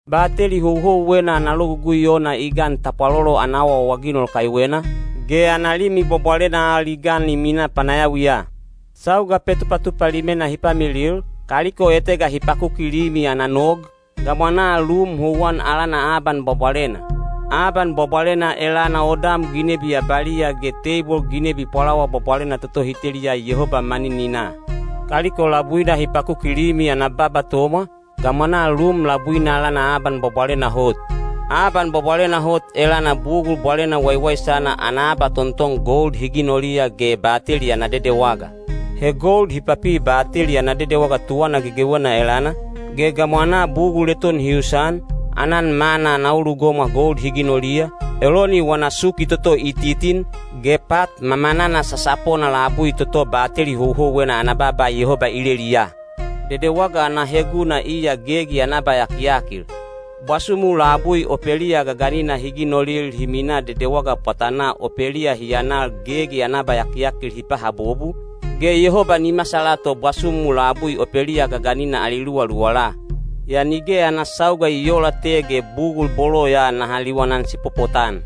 Bateli houhouwena ana logugui ona i gan tapwalolo ana awaawaginol kaiwena, ge ana Limi Bwabwalena al i gan i minaa panayawiya. Sauga Petupatupa Limena hi pamilil, kaliko etega hi pakuki limi ana nog, gamwanaa lum houwan alana Aban Bwabwalena. Aban Bwabwalena elana odam ginebi abaliya ge teibol ginebi beleid bwabwalena toto hi teliya Yehoba manininaa. Kaliko labuina hi pakuki limi ana baba tomwa, gamwanaa lum labuina alana Aban Bwabwalena Hot. Aban Bwabwalena Hot elana bugul bwalena waiwaisana ana abatonton gold hi ginoliya ge Bateli ana Dedewaga. He gold hi papi Bateli ana Dedewaga tuwana gegewena elana, ge gamwanaa bugul eton hi usan: aanan manna ana ulugomwa gold hi ginoliya, Eloni wana suki toto i titin, ge pat mamanana sasapona labui toto bateli houhouwena ana baaba Yehoba i leliya. Dedewaga ana heguna iya gegi ana abayakiyakil. Bwasumu labui opeliya gaganina hi ginolil hi minaa dedewaga pwatanaa opeliya hi anal gegi ana abayakiyakil hi pahabobu, ge Yehoba ni masala to bwasumu labui opeliya gaganina ali luwaluwala. Yaa nige ana sauga i oola te ge tage bugul bolo ya naha liwanan sipopotan.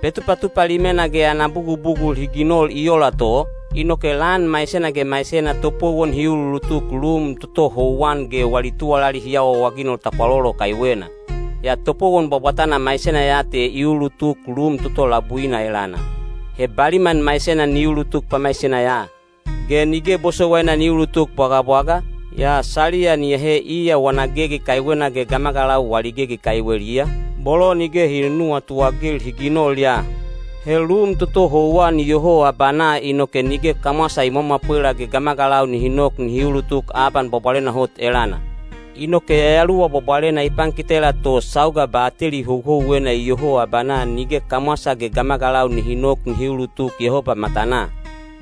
Petupatupa Limena ge ana bugubugul hi ginol i ola to, inoke lan maisena ge maisena topowon hi uluulutuk lum toto houwan ge wali tuwalali hi awaawaginol tapwalolo kaiwena. Yaa topowon bwabwatana maisena ya te i uulutuk lum toto labuina elana. He baliman maisena ni ulutuk pamaisena ya. Ge nige bosowaina ni ulutuk bwagabwaga, yaa saliya ni ahe iya wana gegi kaiwena ge gamagalau wali gegi kaiweliya, bolo nige hi nunuwatu-agil hi ginol ya. He lum toto houwan iyoho abanaa inoke nige kamwasa i mwamwapwela ge gamagalau nihi nok nihi ulutuk Aban Bwabwalena Hot elana. Inoke Yayaluwa Bwabwalena i pankitela to sauga bateli houhouwena iyoho abanaa nige kamwasa ge gamagalau nihi nok nihi ulutuk Yehoba matanaa.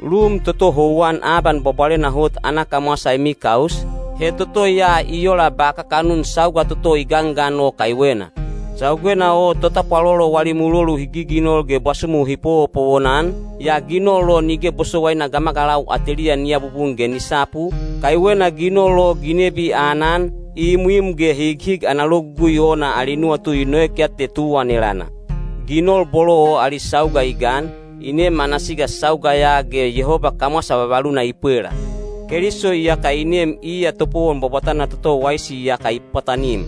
Lum toto houwan Aban Bwabwalena Hot ana kamwasa i mikaus, he toto ya i ola ba kakanun sauga toto i gangan o kaiwena. Saugena o totapwalolo wali mulolu hi giginol ge bwasumu hi powopowon-an, yaa ginol o nige bosowaina gamagalau ateliya ni abubun ge ni sapu, kaiwena ginol o ginebi aanan, imwim ge highig ana logugui ona ali nuwatu i noek ya te tuwan elana. Ginol bolo o ali sauga i gan, i nem ana siga sauga ya ge Yehoba kamwasa vavaluna i pwela. Keliso iyaka i nem iya topowon bwabwatana toto waisi iyaka i pwatanim.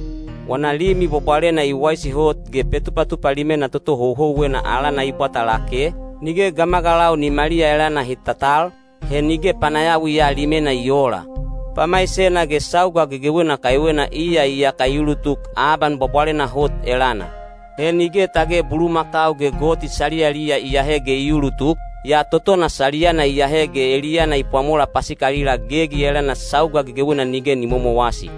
Wana limi bwabwalena i waisi hot ge Petupatupa Limena toto houhouwena alana i bwata lake, nige gamagalau nimaliya elana hi tatal, he nige panayawi ya limena i oola. Pamaisena ge sauga gegewena kaiwena iya iyaka i ulutuk Aban Bwabwalena Hot elana. He nige tage bulumakau ge goti saliyaliya i ahe ge i ulutuk, yaa totona saliyana i ahe ge eliyana i pwamola pasikalila gegi elana sauga gegewena nige ni momowasi.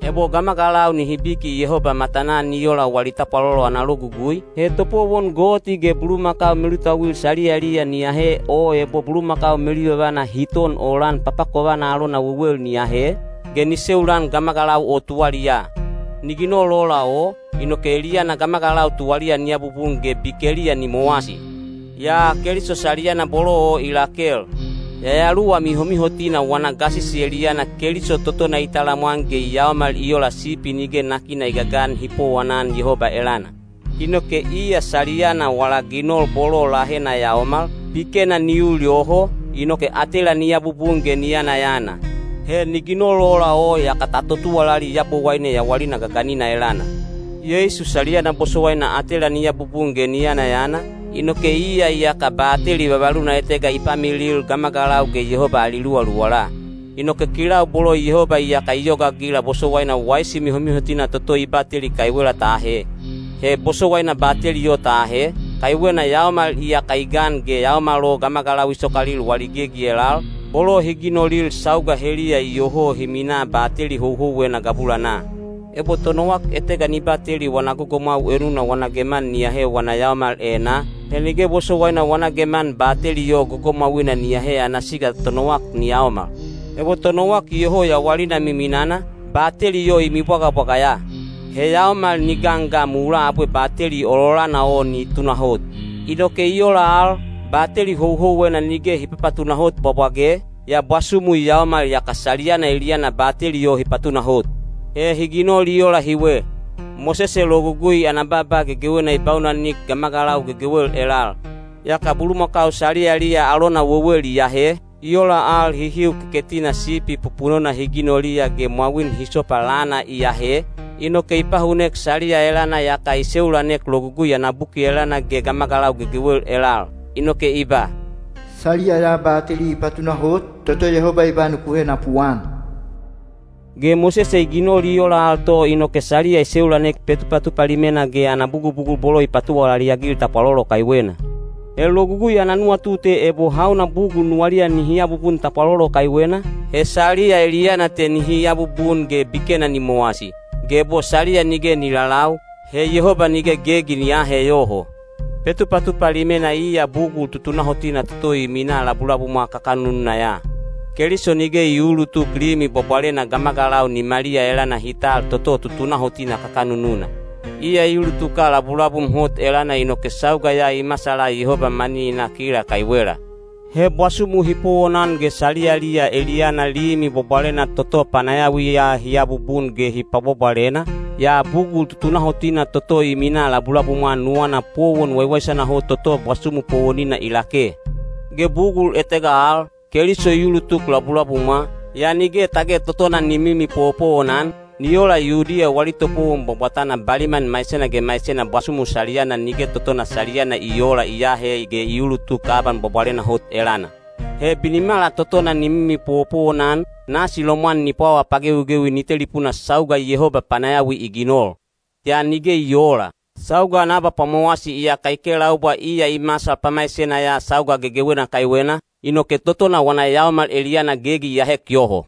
Ebo gamagalau nihi biki Yehoba matanaa ni ola wali tapwalolo ana logugui, he topowon goti ge bulumakau melutauil saliyaliya ni ahe o ebo bulumakau meluyovana hi ton olan papakovana alona wewel ni ahe, ge ni seulan gamagalau o tuwaliyaa. Ni ginol ola o, inoke eliyana gamagalau tuwaliya ni abubun ge bikeliya ni mowasi. Yaa Keliso saliyana bolo o i lakel. Yayaluwa Mihomihotina wana gasisi eliyana Keliso totona i talamwan ge i yaomal i ola sipi nige nakina i gagan hi powonan Yehoba elana. Inoke iya saliyana wala ginol bolo lahena yaomal, bikena ni ul yoho, inoke atela ni abubun ge ni yanayana. He ni ginol ola o yaka ta totuwalali Yabowaine yawalina gaganina elana. Yeisu saliyana bosowaina atela ni abubun ge ni yanayana, inoke iya iyaka bateli vavaluna etega i pamilil gamagalau ge Yehoba ali luwaluwala. Inoke kilau bolo Yehoba iyaka i yogaagila bosowaina waisi mihomihotina toto i bateli kaiwela ta ahe. He bosowaina bateli o ta ahe, kaiwena yaomal iyaka i gan ge yaomal o gamagalau i sokalil wali gegi elal, bolo hi ginolil sauga heliya iyoho hi minaa bateli houhouwena gabulanaa. Ebo tonowak etega ni bateli wana gogomwau enuna wana geman ni ahe wana yaomal enaa, he nige bosowaina wana geman bateli o gogomwauina ni ahe ana siga tonowak ni yaomal. Ebo tonowak iyoho yawalina miminana, bateli o i mibwagabwaga ya. He yaomal ni gan ga mulaa abwe bateli ololana o ni tunahot. Inoke i ola al, bateli houhouwena nige hi papatunahot bwabwage, yaa bwasumu i yaomal yaka saliyana eliyana bateli o hi patunahot. He hi ginol i ola hiwe. Mosese Logugui ana baaba gegewena i baunanik gamagalau gegewel elal. Yaka bulumakau saliyaliya alona wewel i ahe, i ola al hihiu keketina sipi pupunona hi ginoliya ge mwawin hisopa lana i ahe, inoke i pahunek saliya elana yaka i seulanek Logugui ana buki elana ge gamagalau gegewel elal. Inoke i ba, “Saliya ya bateli i patunahot, toto Yehoba i ba nuku henapuan.” Ge Mosese i ginol i ola al to inoke saliya i seulanek Petupatupa Limena ge ana bugubugul bolo hi patuwalali-agil tapwalolo kaiwena. He Logugui ana nuwatu te ebo hauna bugul nuwaliya nihi abubun tapwalolo kaiwena, he saliya eliyana te nihi abubun ge bikena ni mowasi. Ge ebo saliya nige ni lalau, he Yehoba nige gegi ni aahe yoho. Petupatupa Limena iya bugul tutunahotina toto i minaa labulabumwa kakanununa ya. Keliso nige i uulutuk limi bwabwalena gamagalau nimaliya elana hi tal toto tutunahotina kakanununa. Iya i ulutuka labulabum hot elana inoke sauga ya i masala Yehoba manininaa kila kaiwela. He bwasumu hi powonan ge saliyaliya eliyana limi bwabwalena toto panayawiya hi abubun ge hi pwabwabwalena, yaa bugul tutunahotina toto i minaa labulabumwa nuwana powon waiwaisana hot toto bwasumu powonina i lake. Ge bugul etega al, Keliso i ulutuk labulabumwa, yaa nige tage totona ni mimi powopowonan, ni ola Yudiya wali topowon bwabwatana baliman maisena ge maisena bwasumu saliyana (nige totona saliyana i oola) i aahe ge i uulutuk Aban Bwabwalena Hot elana. He binimala totona ni mimi powopowon-an, nasi lomwan ni pwawa pagewigewi ni telipunaa sauga Yehoba panayawi i ginol. Yaa nige i oola. Sauga ana abapwamowasi iyaka i kelaubwa iya i masal pamaisena ya sauga gegewena kaiwena, inoke totona wana yaomal eliyana gegi i ahek yoho.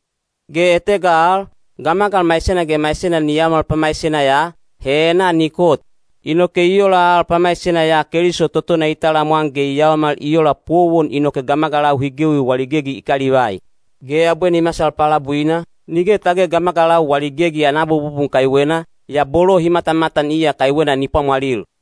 Ge etega al, gamagal maisena ge maisena ni yaomal pamaisena ya, he enaa ni kot. Inoke i ola al pamaisena ya Keliso totona i talamwan ge i yaomal i ola powon inoke gamagalau hi gewi wali gegi i kalivai. Ge abwe ni masal palabuina, nige tage gamagalau wali gegi ana abububun kaiwena, yaa bolo hi matamatan iya kaiwena ni pwamwalil.